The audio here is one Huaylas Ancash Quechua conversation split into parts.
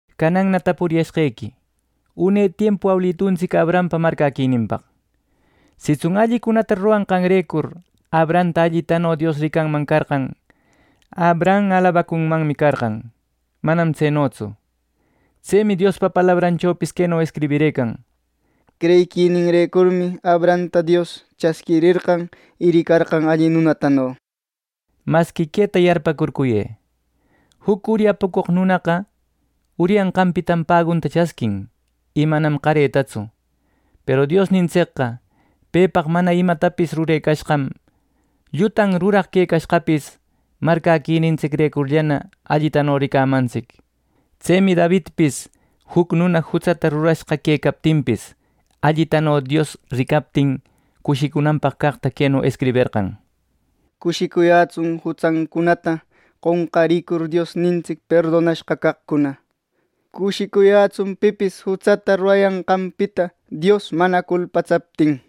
Cananna tapuriyashqequi une tiempu awiluntsic Abrahampa marcäquininpaq. Sitsun allicunata ruranqanrecur Abrahamta allitano Dios ricanman carqan; Abraham alabacunmanmi carqan. ¡Manam tsenotsu! Tsemi Diospa palabranchopis queno escribirëcan: “Creyiquininrecurmi Abrahamta Dios chasquirerqan y ricarqan alli nunatano” nir. Masqui queta yarpäcurcuyë: Juc uryapucoq nunaqa uryanqanpitam pagunta chasquin y manam qaretatsu. Peru Diosnintsicqa pepaq mana imatapis rurecashqan, llutan ruraq quecashqapis marcäquinintsicrecurllana allitano ricamantsic. Tsemi Davidpis juc nuna jutsata rurashqa quecaptinpis, allitano Dios ricaptin cushicunanpaq caqta queno escriberqan: “¡Cushicuyätsun, jutsancunata qonqarïcur Diosnintsic perdonashqa caqcuna! ¡Cushicuyätsun pipis jutsata rurayanqanpita Dios mana culpatsaptin!” nir.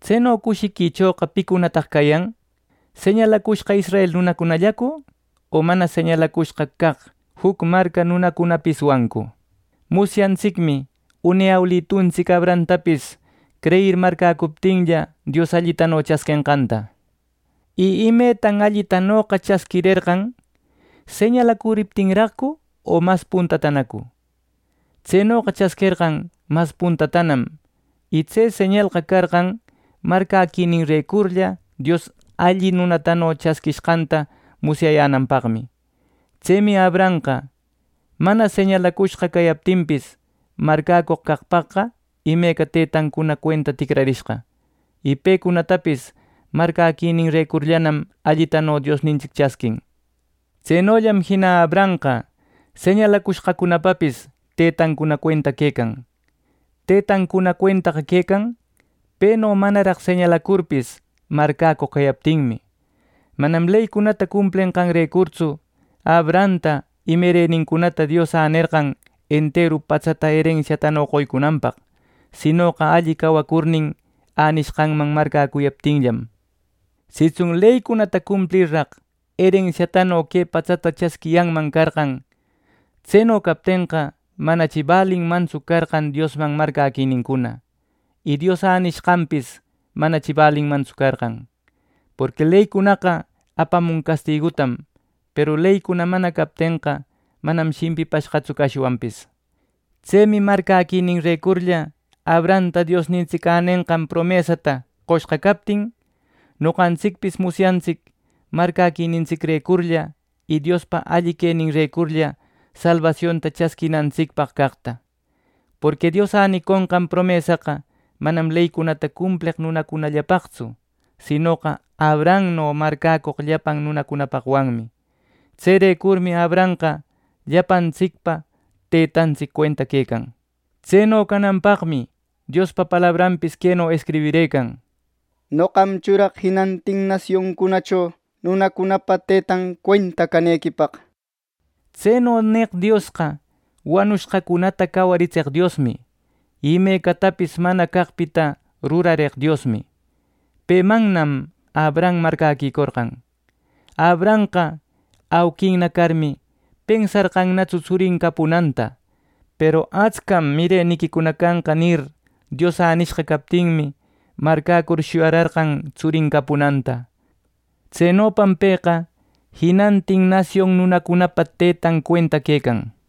Tseno cushiquichoqa ¿picunataq cayan: señalacushqa israel nunacunallacu, o mana señalacushqa caq juc marca nunacunapiswancu? Musyantsicmi une awilituntsic Abrahamtapis creyir marcäcuriptinlla, Dios allitano chasquenqanta. ¿Y imetan allitanoqa chasquirerqan: señalacuriptinraqcu o mas puntatanacu? Tsenoqa chasquerqan mas puntatanam. Y tse señalqa carqan marcäquininrecurlla Dios alli nunatano chasquishqanta musyayänanpaqmi. Tsemi Abrahamqa mana señalacushqa cayaptinpis marcäcoq caqpaqqa imeca tëtancuna cuenta ticrarishqa, y pecunatapis marcäquininrecurllanam allitano Diosnintsic chasquin. Tsenollam jina Abrahamqa señalacushqacunapapis tëtancuna cuenta quecan. Tëtancuna cuentaqa, quecan, peno manaraq señalacurpis, marcäcoq cayaptinmi. Manam leycunata cumplenqanrecurtsu Abrahamta y mirenincunata Dios änerqan enteru patsata erensiatano qoycunanpaq, sinoqa alli cawacurnin änishqanman marcäcuyaptinllam. Sitsun leycunata cumplirraq erensiatano que patsata chasquiyanman carqan, tseno captenqa manachi balinmantsu carqan Diosman marcäquinincuna. Y Dios änicushqanpis manachi balinmantsu carqan. Porqui leycunaqa apamun castigutam. Peru leycuna mana captenqa manam shimpishqatsu cashwanpis. Tsemi marcäquininrecurlla Abrahamta Diosnintsic änenqan promesata qoshqa captin, noqantsicpis musyarintsic marcäquinintsicrecurlla y Diospa alli queninrecurlla salbasionta chasquinantsicpaq caqta. Porqui Dios äniconqan promesaqa manam leycunata cumpleq nunacunallapaqtsu; sinoqa Abrahamno marcäcoq llapan nunacunapaqwanmi. Tserecurmi Abrahamqa llapantsicpa tëtantsic cuenta quecan. Tseno cananpaqmi Diospa palabranpis queno escribirëcan: “Noqam churaq jinantin nasioncunacho nunacunapa tëtan cuenta canequipaq” nir. Tseno neq Diosqa, wanushqacunata cawaritseq Diosmi, y imecatapis mana caqpita rurareq Diosmi. Pemannam Abraham marcäquicorqan. Abrahamqa auquinna carmi, pensarqannatsu tsurin capunanta. Peru “Atscam mireniquicuna canqa” nir, Dios nishqa captinmi marcäcur shuyararqan tsurin capunanta. Tsenopam pëqa “jinantin nasion nunacunapa tëtan cuenta” quecan.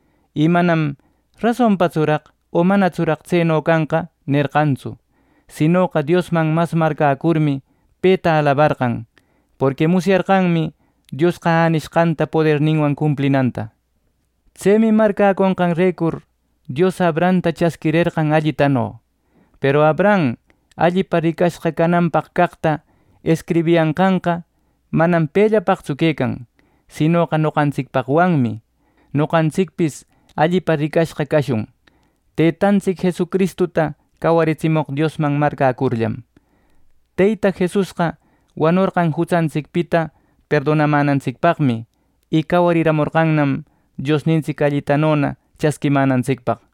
Y manam “¿rasontsuraq o manatsuraq tseno canqa?” nerqantsu; sinoqa Diosman mas marcäcurmi peta alabarqan; porqui musyarqanmi Diosqa änishqanta poderninwan cumplinanta. Tsemi marcäconqanrecur, Dios Abrahamta “chasquirerqan allitano.” Peru Abraham allipa ricashqa cananpaq caqta escribiyashqanqa, manam pellapaqtsu quecan; sinoqa noqantsicpaqwanmi: Noqantsicpis allipa ricashqa cashun, Teytantsic Jesucristuta cawaritsimoq Diosman marcäcurllam. Teyta Jesusqa wanorqan jutsantsicpita perdonamänantsicpaqmi, y cawarimorqannam Diosnintsic allitanona chasquimänantsicpaq.